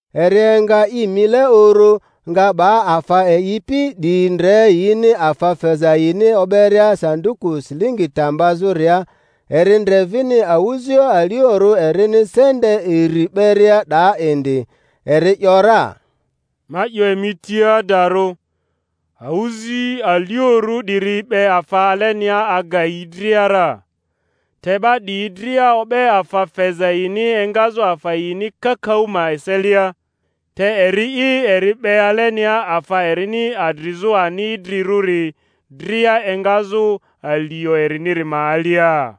Eri enga i mile uru, nga 'ba afa eyipi 'diyi ndre yini afa feza yini o'beria sanduku silingi ta mbazᴜria; eri ndre vini awᴜzioᴜ aliorᴜ erini sente iri 'beria 'daa indi. Eri ‘yora, Ma 'yo emi tia adarᴜ, awᴜzi aliorᴜ 'diri 'be afa alenia aga yi dria ra; te 'ba 'diyi dria o'be afa feza yini engazᴜ afa yini kakaᴜ ma eselia, te eri'i eri 'be alenia afa erini adrizᴜ ani idrirᴜri dria engazᴜ alio eriniri ma alia.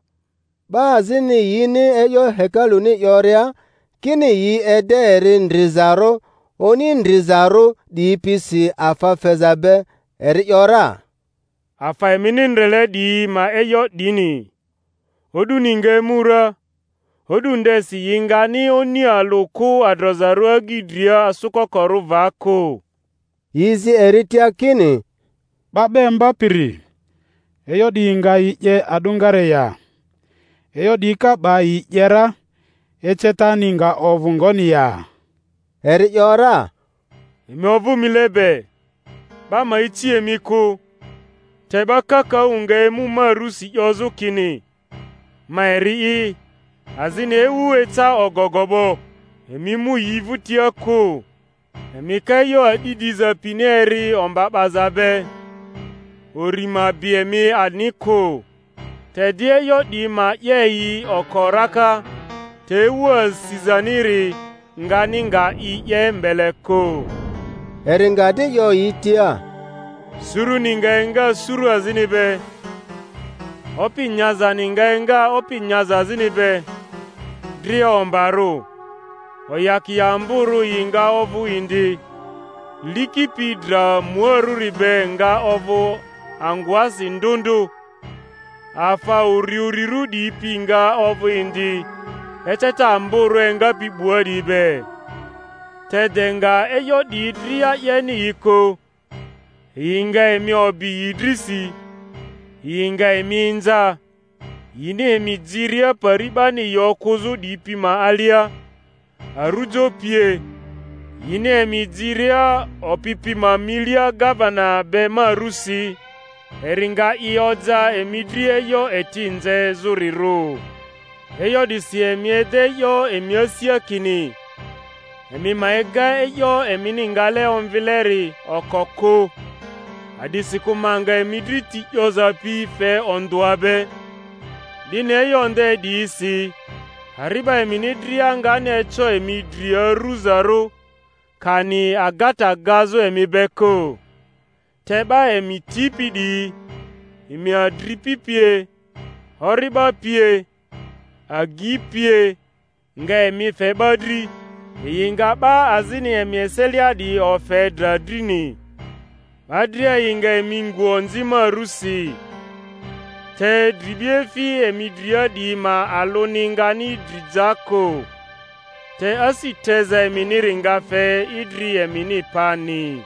'Ba azini yini e'yo hekaluni 'yoria, kini yi ede eri ndrizaru oni ndrizarᴜ 'diyi pisi afa feza be, eri ‘yora, Afa emini ndrele 'diyi ma e'yo 'dini, o'duni nga emu ra, o'du ndesi yi ngani oni alᴜ kᴜ adrozarᴜ agyi dria asᴜkokorᴜ va kᴜ. Yi zi eri tia kini, 'Ba 'ba Imbapiri, e'yo 'diyi nga yi 'ye a'dᴜngare ya? E'yo 'diyi ka 'ba yi 'ye ra, ecetani nga ovᴜ ngoni ya? Eri ‘yora, Emi ovᴜ mile be, 'ba ma ici emi kᴜ; te 'ba kakaᴜ nga emu ma rusi 'yozᴜ kini, Ma eri'i! azini, Ewu eca ogogo 'bo! Emi mu yi vᴜtia kᴜ. Emi ka e'yo a'di 'diza pini eri omba 'baza be, uri ma bi emi ani kᴜ; te di e'yo 'diyi ma 'ye yi oko raka, te ewu asizaniri ngani nga i 'ye mbele kᴜ. Eri nga di 'yo yi tia, Suruni nga enga suru azini be, opi nyazani nga enga opi nyaza azini be, dria ombarᴜ; oyakia amborᴜ yi nga ovᴜ indi, liki pi dra muarᴜri be nga ovᴜ angᴜasi ndᴜ ndᴜ, afa uriurirᴜ 'diyi pi nga ovᴜ indi eceta amborᴜ engapi 'bua 'diyi be. Te de nga e'yo 'diyi dria 'yeni yi kᴜ, yi nga emi obi yi drisi, yi nga emi inza, yini emi jiria pari 'bani yi okᴜzᴜ 'diyi pi ma alia, arujo pie, yini emi jiria opi pi ma milia gavena be ma rusi. Eri nga i oja emi dri e'yo eti nzezᴜrirᴜ. E'yo 'disi emi ede e'yo emi asia kini emi ma ega e'yo emini ngale omvileri oko kᴜ; a'disikᴜ ma nga emi dri ti 'yoza pi fe ondᴜa be, 'dini e'yo nde 'diyisi ari'ba emini dria ngani eco emi dri aruzarᴜ, kani agata gazᴜ emi be kᴜ. Te 'ba emi tipi 'diyi, emi adripi pie, ori'ba pie, agyi pie, nga emi fe 'ba dri, yi nga 'ba azini emi eselia 'diyi ofe dra drini; 'ba dria yi nga emi ngu onzi ma rusi. Te dribiefi emi dria 'diyi ma alᴜni ngani dri ja kᴜ. Te asi teza eminiri nga fe idri emini pani.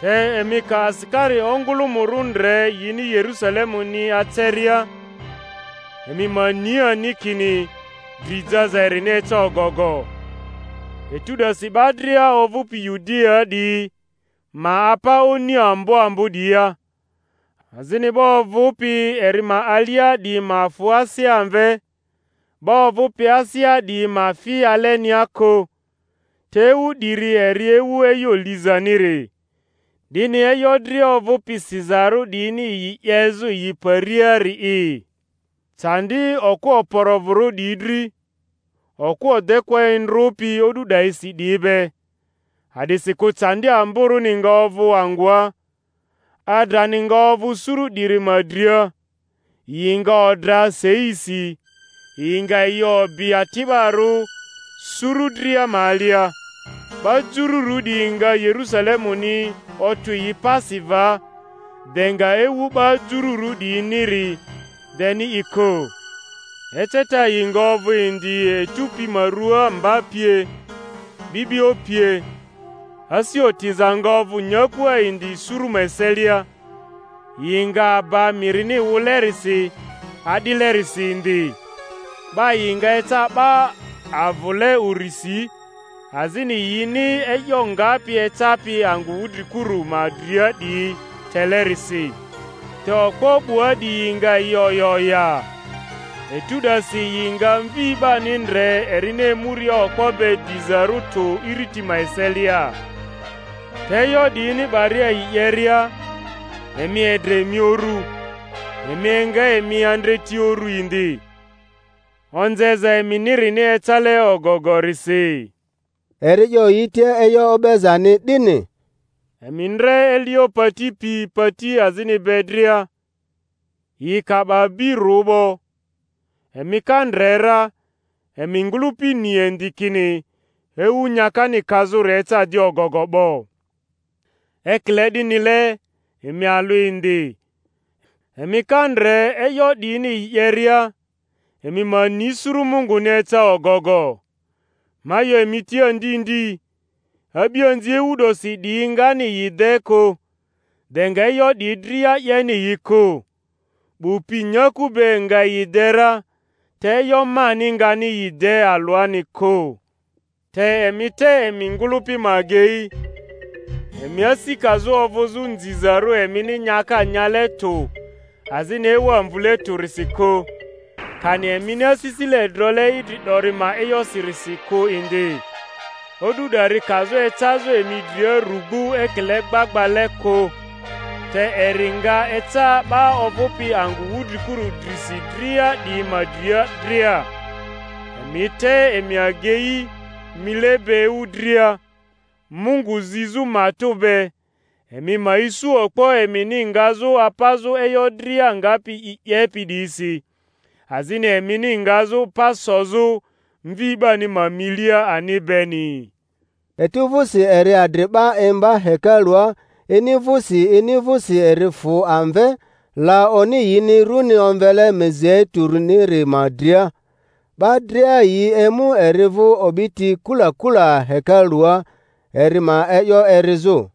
Te emi ka asikari ongᴜlᴜmᴜrᴜ ndre yini Yerusalemuni aceria, emi ma ni ani kini dri jaza erini eca ogogo. Etu 'dasi 'ba dria ovᴜpi Yudiaa 'diyi ma apa oni ambo ambo 'diyia, azini 'ba ovᴜpi eri ma alia 'diyi ma fᴜ asea amve, 'ba ovᴜpi asea 'diyi ma fi alenia kᴜ. Te ewu 'diri eri ewu e'yo lizaniri, 'dini e'yo dria ovᴜpi sizarᴜ 'diyini yi 'yezᴜ yi pariari'i. Candi okᴜ okporo-vᴜrᴜ 'diyi dri, okᴜ odekᴜa endrᴜpi o'du 'dayisi 'diyi be! A'disikᴜ candi amborᴜni nga ovᴜ angᴜa, adrani nga ovᴜ suru 'diri ma dria; yi nga odra seisi, yi nga yi obi ati'barᴜ suru dria ma alia; 'ba Jururᴜ 'diyi nga Yerusalemuni otᴜ yi pasi va, de nga ewu 'ba Jururᴜ 'diyiniri deni i kᴜ. Eceta yi nga ovᴜ indi etu pi ma ruaa, mba pie, 'bi'bio pie; asi otiza nga ovᴜ nyakua indi suru ma eselia, yi nga aba mirini wᴜlerisi adilerisi indi; 'ba yi nga eca 'ba avᴜle urisi, azini yini e'yo ngapi ecapi angᴜ wudrikuru ma dria 'diyi telerisi; te okpo 'bua 'diyi nga yi oya oya. Etu 'dasi yi nga Mvi 'bani ndre erini emuria okpo be dizarᴜ tᴜ iriti ma eselia. Te e'yo 'diyini 'baria yi 'yeria, emi edre emi uru, emi enga emi andreti uru indi, onzeza emini-rini ecale ogogorisi. Eri 'yo yi tia e'yo o'bezani 'dini: Emi ndre elio pati pi pati azini be dria; yi ka'ba bi rᴜ 'bo, emi ka ndre ra, emi ngᴜlᴜpi ni indi kini ewu nyakani kazᴜri eca di ogogo 'bo. Ekile 'dinile emi alᴜ indi, emi ka ndre e'yo 'diyini yi 'yeria, emi ma ni suru Munguni eca ogogo. Ma 'yo emi tia ndi ndi, a'bianzi ewu 'dosi 'diyi ngani yi de kᴜ, de nga e'yo 'diyi dria 'yeni yi kᴜ. 'Bu pi nyaku be nga yi de ra, te e'yo mani ngani yi de alᴜani kᴜ. Te emi te emi ngᴜlᴜpi ma agei, emi asi kazᴜ ovᴜzᴜ nzizarᴜ emini nyaka nyale tᴜ azini ewa mvule tᴜrisi kᴜ, kani emini asisile drole idri 'dori ma e'yosirisi kᴜ indi, o'du 'dari kazᴜ ecazᴜ emi dria rugbu ekile gbagbale kᴜ; te eri nga eca 'ba ovᴜpi angᴜ wudrikuru drisi dria 'diyi ma dria dria. Emi te emi agei mile be ewu dria, Mungu zizᴜ matᴜ be, emi ma isu okpo emini ngazᴜ apazᴜ e'yo dria ngapi yi 'yepi 'diyisi, azini emini ngazᴜ pa sozᴜ Mvi 'bani ma milia ani beni. Etu vᴜsi eri adri 'ba imba hekalua; ini vᴜsi ini vᴜsi eri fᴜ amve, la oni yini runi omvele Mizeituniri ma dria. 'Ba dria yi emu eri vᴜ o'biti kula kula hekalua, eri ma e'yo erizᴜ.